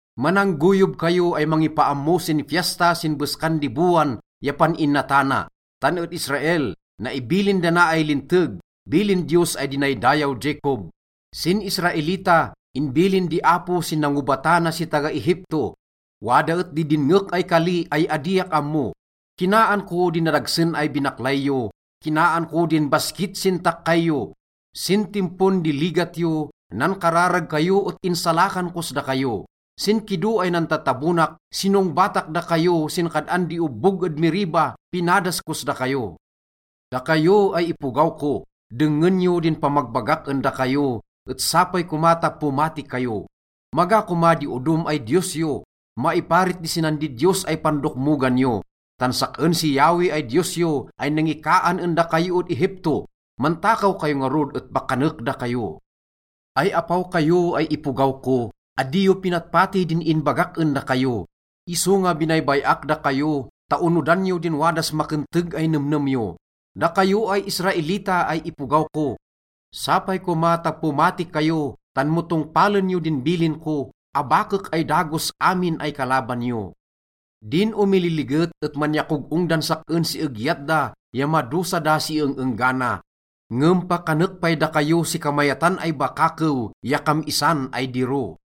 Mananggoyob kayo ay mangipaammo sin fiesta sin beskan di bowan ya pan-inatana. Tan ed Israel, naibilin dana ay linteg, bilin Diyos ay dinaydayaw Jacob. Sin Israelita, inbilin di Apo sin nangobatana si taga-Egipto. Wada et di dinngek ay kali ay adiak ammo: “Kinaan ko din nadagsen ay binaklay yo, kinaan ko din baskit sin takkay yo. Sin timpon di ligat yo, nankararag kayo et insalakan kos dakayo. Sin kido ay nantatabonak, sinongbatak dakayo, sin kad-an di obbog ed Meriba pinadas kos dakayo. Dakayo ay ipogaw ko, dengngen yo din pamagbagak en dakayo, et sapay koma ta pomati kayo. Maga koma di odom ay diyos yo, maiparit di sinan didiyos ay pandokmogan yo, tan sak-en si Yahweh ay Diyos yo ay nangikaan en dakayo ed Egipto. Mantakaw kayo ngarud et pakanek dakayo. Ay apaw kayo ay ipogaw ko, adi yo pinatpati din inbagak en dakayo. Isonga binaybay-ak dakayo ta onodan yo din wadas makenteg ay nemnem yo. Dakayo ay Israelita ay ipogaw ko, sapay koma ta pomati kayo, tan mo tongpalen yo din bilin ko, abakek ay dagos amin ay kalaban yo. Din omililiget et manyakog-ong dan sak-en si egyat da ya madosa da si eng-enggana. Ngem pakanek pay dakayo si kamayatan ay bakakew ya kam-isan ay diro.”